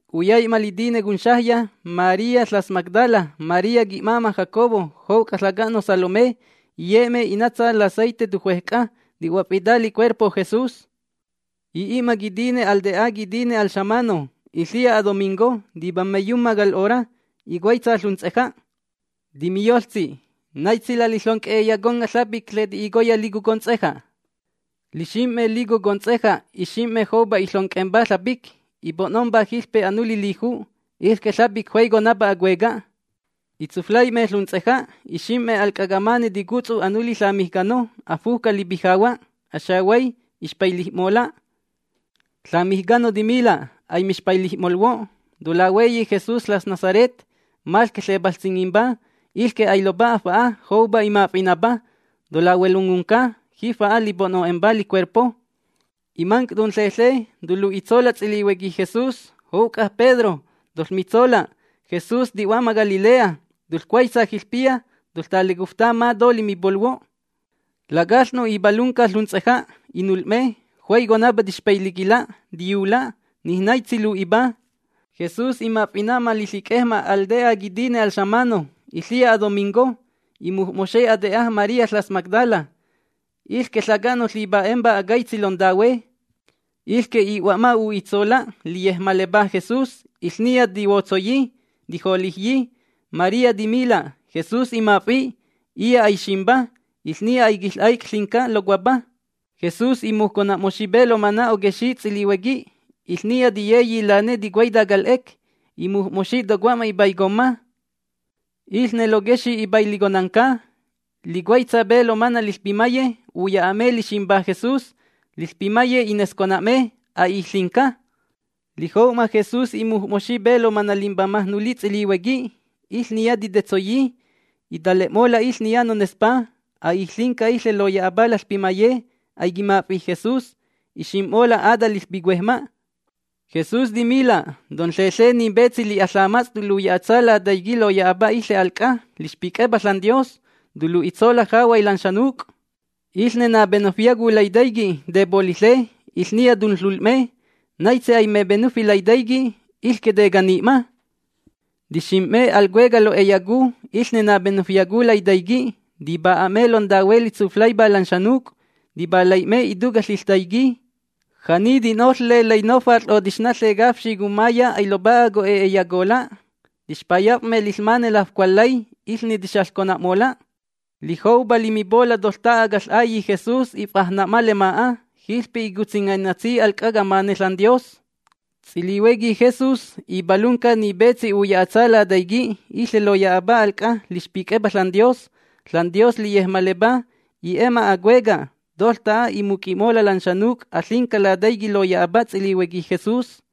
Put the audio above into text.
Luyai'ma litine conxajya María ƚas Magdala, María qui'máma' Jacobo, jouc'a ƚaca'no' Salomé, iye'me i'natsa laceite tujuej c'a ti'huof'ita licuerpo Jesús. I'i'ma quitine al te'a quitine al xamano. (Iƚiya adomingo.) Tipammaiyumma cal 'ora, icuaitsa ƚunts'eja'. Timiyoƚtsi: ―¿Naitsi laliƚonc'e'eyaconga' ƚapic ƚeti'icoya lico cunts'eja'? Lixim'me lico cunts'eja' ixim'me joupa iƚonc'empa ƚapic, ipo'nompa jiƚpe anuli liju'. Iƚque ƚapic juaiconapa acueca'. Itsuflai'me ƚunts'eja', ixim'me al c'a camane ticutsu anuli ƚamijcano. Afujca lipijahua', axehuay. Ixpailij'mola'. Ƚamijcano timila': ―Aimixpailij'molhuo'. Tolahueyi Jesús ƚas Nazaret, maƚque ƚepaƚts'ingimpa. Ilque ailopa'a fa'a. Joupa imaf'inapa. ¡Tolahuelongunca! Jifa'a lipo'no'empa licuerpo. Imanc' tonƚenƚe, tolu'itsola' ts'ilihuequi Jesús, jouc'a Pedro, toƚmitsola': “Jesús ti'hua'ma Galilea. Toƚcuaitsa jiƚpiya toƚtalecufta ma to limipolhuo'.” Lacaƚ'no' ipalunca ƚunts'eja'. Inul'me. Juaiconapa tixpailiquila', tiyula'. Nij naitsi lu'ipa. Jesús imaf'ina'ma liƚic'ejma' al te'a quitine al xamano, iƚiya adomingo. Imuj'moxi ate'a María ƚas Magdala, iƚque ƚaca'no' ƚipa'empa acaitsi lontahue. Iƚque i'hua'ma u'itsola' liyejmalepá Jesús. Iƚniya tihuotsoyi, tijolijyi. María timila': ―Jesús imaf'i'. Iya' aiximpa. Iƚniya aiquiƚ'aic' ƚinca locuapa. Jesús imujcona'moxi pe lomana' oquexi' ts'ilihuequi. Jiƚniya tiyeyi lane ticuaita cal 'ec. Imuj'moxi tocomma ipaicomma. Iƚne loquexi' ipailiconanca, licuaitsa pe lomana' liƚpimaye, uya'a'me liximpa Jesús. Liƚpimaye inescona'me: “A'ij ƚinca”. Lijou'ma Jesús imuj'moxi pe lomana' limbamaj nuli ts'ilihuequi. Iƚniya titetsoyi. Itale'mola' iƚniya nonespá: “A'ij ƚinca iƚe loya'apa laƚpimaye. Aiquimaf'i' Jesús.” Ixim'mola' ata liƚpicuejma'. Jesús timila': ―Tonƚeƚe ni petsi li'a ƚamats'. Toluya'atsa Lataiqui' loya'apa iƚe al c'a lixpic'epa ȽanDios. Tolu'itsola' jahuay lan xanuc'. Iƚne napenufyacu Lataiqui', tepoliƚe, iƚniya tunƚul'me. Naitsi aimepenufi Lataiqui', iƚque tecani'ma. ’Tixinim'me al cueca' lo'eyacu iƚne napenufyacu Lataiqui'. Tipa'a'me lontahue litsuflaipá lan xanuc', tipalai'me ituca' liƚtaiqui'. Ja'ni ti'noƚƚe lainofat'ƚ o tixnaƚe cafxi cummaiya ailopa'a co'e'eyacola'. Tixpayaf'me liƚmane lafcualƚay, iƚne tixaƚcona'mola'. Lijoupa limipola' toƚta'a caƚ'Ailli' Jesús if'ajna'ma lema'a. Jiƚpe icutsingaitsi al c'a camane ȽanDios. Ts'ilihuequi Jesús ipalunca. Ni petsi uya'atsa Lataiqui', iƚe loya'apa al c'a lixpic'epa ȽanDios. ȽanDios liyejmalepa, i'e'ma acueca'. Toƚta'a imuc'i'mola' lan xanuc' aƚinca Lataiqui' loya'apa ts'ilihuequi Jesús.